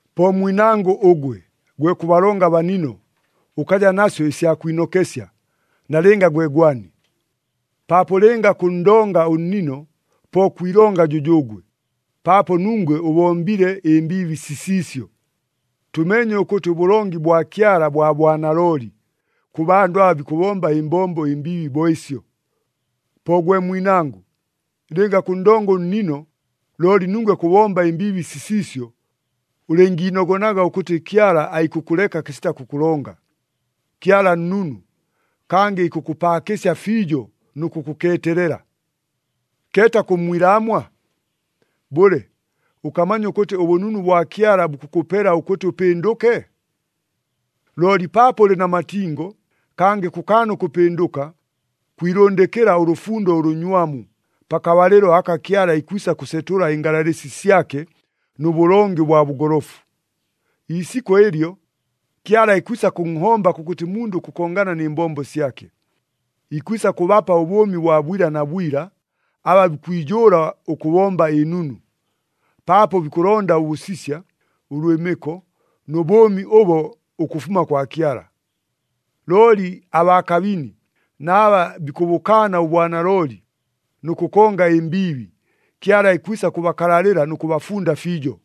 Po mwinangʉ ʉgwe, gwe kʉbalonga abanino, ʉkaja nasyo ɨsya kwinokesya, nalɨnga gwe gwani. Paapo lɨnga kʉnndonga ʉnniino, po kwilonga jʉjʉʉgwe, paapo nungwe ʉbombile ɨmbiibi sisiisyo. Tʉmeenye ʉkʉtɨ ʉbʉlongi bwa Kyala bwa bwanalooli, kʉ bandʉ aba bikʉbomba ɨmbombo ɨmbiibi bo ɨsyo. Po gwe mwinangʉ, lɨnga kʉnndonga ʉnnino looli nungwe kʉbomba ɨmbiibi sisiisyo, ʉlɨngiinogonaga ʉkʉtɨ Kyala aikʉkʉleka kɨsita kʉkʉlonga. Kyala nnunu, kangɨ ikʉkʉpaakɨsya fiijo nʉ kʉkʉkeetelela. Keeta kʉmmwilaamwa? Bʉle, ʉkamanya ʉkʉtɨ ʉbʉnunu bwa Kyala bukʉkʉpela ʉkʉtɨ ʉpɨndʉke? Looli paapo ʉlɨ na matingo, kangɨ kʉkaana ʉkʉpɨndʉka, kwilʉndɨkɨla ʉlʉfundo ʉlʉnywamu, pakabalɨlo aka Kyala ikwisa kʉsetʉla ɨngalalɨsi syake nʉ bʉlongi ʉbwa bʉgolofu. Iisikʉ ɨlyo, “Kyala ikwisa kʉnhomba kʉkʉtɨ mundʉ ʉkʉkongana nɨ mbombo syake.” Ikwisa kʉbapa ʉbʉʉmi bwa bwila na bwila, aba bikwijʉʉla ʉkʉbomba ɨnunu, paapo bikʉlonda ʉbʉsisya, ʉlwɨmɨko nʉ bʉʉmi ʉbo ʉkʉfuma kwa Kyala. Looli abaa kabini na aba bikʉbʉkaana ʉbwanalooli, nʉ kʉkonga ɨmbiibi, Kyala ikwisa kʉbakalalɨla nʉ kʉbafunda fiijo.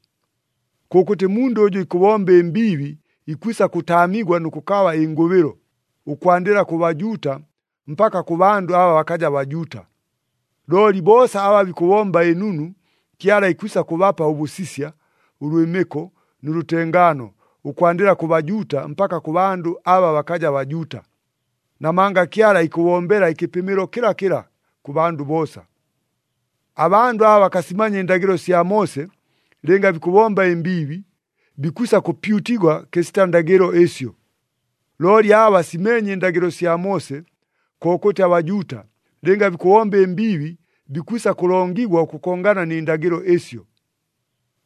Kʉkʉtɨ mundʉ ʉjʉ ikʉbomba ɨmbiibi ikwisa kʉtaamigwa nʉ kʉkaba ɨngʉbɨlo, ʉkwandɨla kʉ Bajuuta, mpaka kʉ bandʉ aba bakaja Bajuuta. Looli boosa aba bikʉbomba ɨnunu, Kyala ikwisa kʉbapa ʉbʉsisya, ʉlwɨmɨko nʉ lʉtengaano, ʉkwandɨla kʉ Bajuuta, mpaka kʉ bandʉ aba bakaja Bajuuta. Namanga Kyala ikʉbombela ɨkɨpɨmɨlo kɨlakɨla kʉ bandʉ boosa. Abandʉ aba bakasimanya ɨndagɨlo sya Moose, lɨnga bikʉbomba ɨmbiibi, bikwisa kʉpyutigwa kɨsita ndagɨlo ɨsyo. Looli aba basimeenye ɨndagɨlo sya Moose, kokʉtɨ aBajuuta, lɨnga bikʉbomba ɨmbiibi, bikwisa kʉlongigwa ʉkʉkongana nɨ ndagɨlo ɨsyo.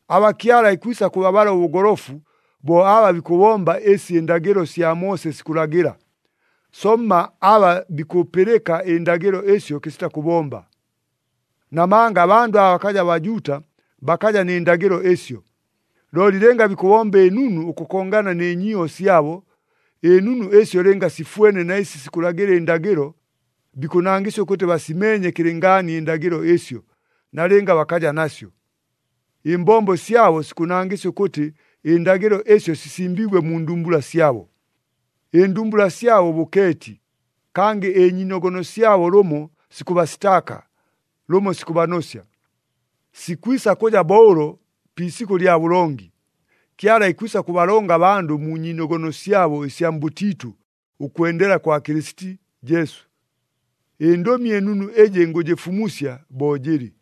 Aba Kyala ikwisa kʉbabala ʉbʉgolofu, bo aba bikʉbomba ɨsi ɨndagɨlo sya Moose sikʉlagɨla, somma aba bikʉpɨlɨka ɨndagɨlo ɨsyo kɨsita kʉbomba. Namanga abandʉ aba bakaja Bajuuta bakaja nɨ ndagɨlo ɨsyo. Looli lɨnga bikʉbomba ɨnunu ʉkʉkongana nɨ nyiiho syabo, ɨnunu ɨsyo lɨnga sifwene na ɨsi sikʉlagɨla ɨndagɨlo, bikʉnangɨsya ʉkʉtɨ basimeenye kɨlɨngaani ɨndagɨlo ɨsyo, nalɨnga bakaja nasyo. Ɨmbombo syabo sikʉnangɨsya ʉkʉtɨ ɨndagɨlo ɨsyo sisimbiigwe mu ndumbula syabo. Ɨndumbula syabo bʉkeeti, kangɨ ɨnyiinogono syabo lʉmo sikʉbasitaaka, lʉmo sikʉbanosya. Sikwisa kʉja bo ʉlo pi isikʉ lya bʉlongi. Kyala ikwisa kʉbalonga abandʉ mu nyiinogono syabo ɨsya mbʉtiitʉ ʉkwendela kwa Kɨlɨsiti Jesu. ƗNdʉmi ɨNunu ɨjɨ ngʉjɨfumusya bo jɨlɨ.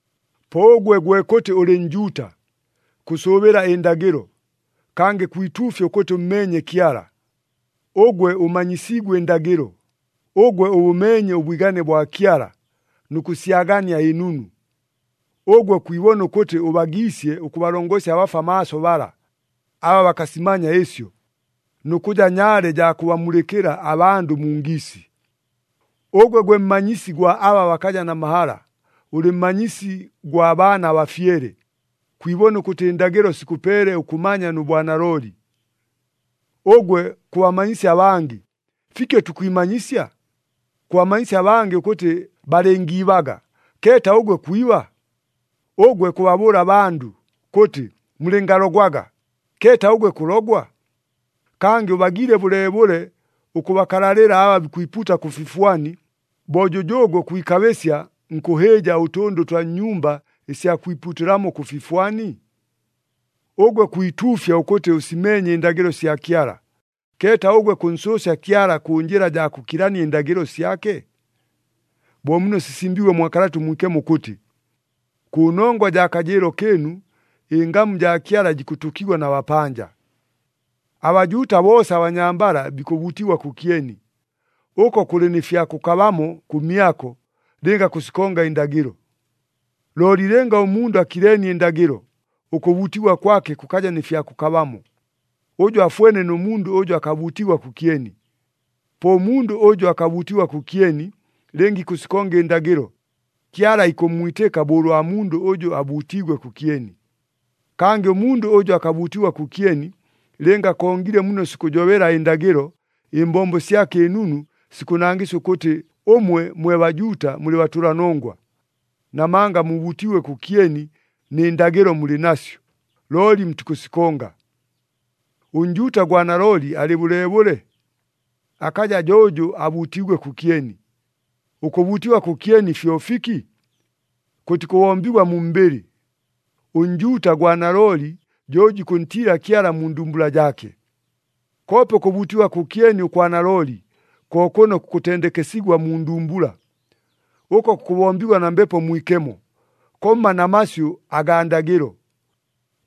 Po ʉgwe gwe kʉtɨ ʉlɨ Njuuta, kʉsʉʉbɨla ɨndagɨlo, kangɨ kwituufya ʉkʉtɨ ʉmmeenye Kyala, ʉgwe ʉmanyisiigwe ɨndagɨlo, ʉgwe ʉbʉmeenye ʉbwigane bwa Kyala, nʉ kʉsyagania ɨnunu. Ʉgwe kwibona ʉkʉtɨ ʉbagiisye ʉkʉbalongosya abafwa maaso bala, aba bakasimanya ɨsyo, nʉ kʉja nyaale jaa kʉbamulɨkɨla abandʉ mu ngiisi. Ʉgwe gwe mmanyisi gwa aba bakaja na mahala, ʉlɨ mmanyisi gwa baana abafyele, kwibona ʉkʉtɨ ɨndagɨlo sikʉpeele ʉkʉmanya nʉ bwanalooli. Ʉgwe kʉbamanyisya abangɨ, fiki ʉtikwimanyisya? Kʉbamanyisya abangɨ ʉkʉtɨ balɨngiibaga, keeta ʉgwe kwiba? Ʉgwe kʉbabʉʉla abandʉ, kʉtɨ, “Mulɨngalogwaga,” keeta ʉgwe kʉlogwa? Kangɨ ʉbagiile bʉleebʉle ʉkʉbakalalɨla aba bikwipuuta kʉ fifwani, bo jʉjʉʉgwe kwikabɨsya nkʉhɨɨja ʉtʉndʉ ʉtwa nnyumba ɨsya kwipuutɨlamo kʉ fifwani? Ʉgwe kwituufya ʉkʉtɨ ʉsimeenye ɨndagɨlo sya Kyala, keeta ʉgwe kʉnsʉʉsya Kyala kʉ njɨla jaa kʉkilania ɨndagɨlo syake? Bo muno sisimbiigwe mwa Kalata ʉMwikemo ʉkʉtɨ, “Kʉnongwa jaa kajɨɨlo kɨɨnu, ɨngamu jaa Kyala jikʉtʉkigwa na bapanja.” ABajuuta boosa abanyambala bikʉbuutigwa kʉkyeni. Ʉko kʉlɨ nɨ fya kʉkabamo kʉmyako, lɨnga kʉsikonga ɨndagɨlo. Looli lɨnga ʉmundʉ akileenie ɨndagɨlo, ʉkʉbuutigwa kwake kʉkaja nɨ fya kʉkabamo. Ʉjo afwene nʉ mundʉ ʉjʉ akabuutigwa kʉkyeni. Po ʉmundʉ ʉjʉ akabuutigwa kʉkyeni, lɨnga ikʉsikonga ɨndagɨlo, Kyala ikʉmmwitɨka bo ʉlwa mundʉ ʉjʉ abuutiigwe kʉkyeni. Kangɨ ʉmundʉ ʉjʉ akabuutigwa kʉkyeni, lɨnga akongile muno sikʉjobela ɨndagɨlo, ɨmbombo syake ɨnunu sikʉnangɨsya ʉkʉtɨ ʉmwe mwe Bajuuta mulɨ batʉlanongwa. Namanga mubuutiigwe kʉkyeni, nɨ ndagɨlo mulɨ nasyo, looli mutikʉsikonga. ɄNjuuta gwa nalooli alɨ bʉleebʉle? Akaja jo ʉjʉ abuutiigwe kʉkyeni! Ʉkʉbuutigwa kʉkyeni fyo fiki? Kʉtikʉbombigwa mu mbɨlɨ! ɄNjuuta gwa nalooli, jo ʉjʉ ikʉntiila Kyala mu ndumbula jaake. Koope ʉkʉbuutigwa kʉkyeni ʉkwa nalooli, ko kʉno kukʉtendekesigwa mu ndumbula. Ʉko kukʉbombigwa na Mbepo Mwikemo, komma na masyʉ agaa ndagɨlo.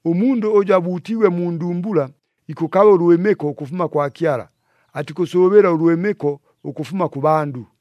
Ʉmundʉ ʉjʉ abuutiigwe mu ndumbula ikʉkaba ʉlwɨmɨko ʉkʉfuma kwa Kyala, atikʉsʉʉbɨla ʉlwɨmɨko ʉkʉfuma kʉ bandʉ.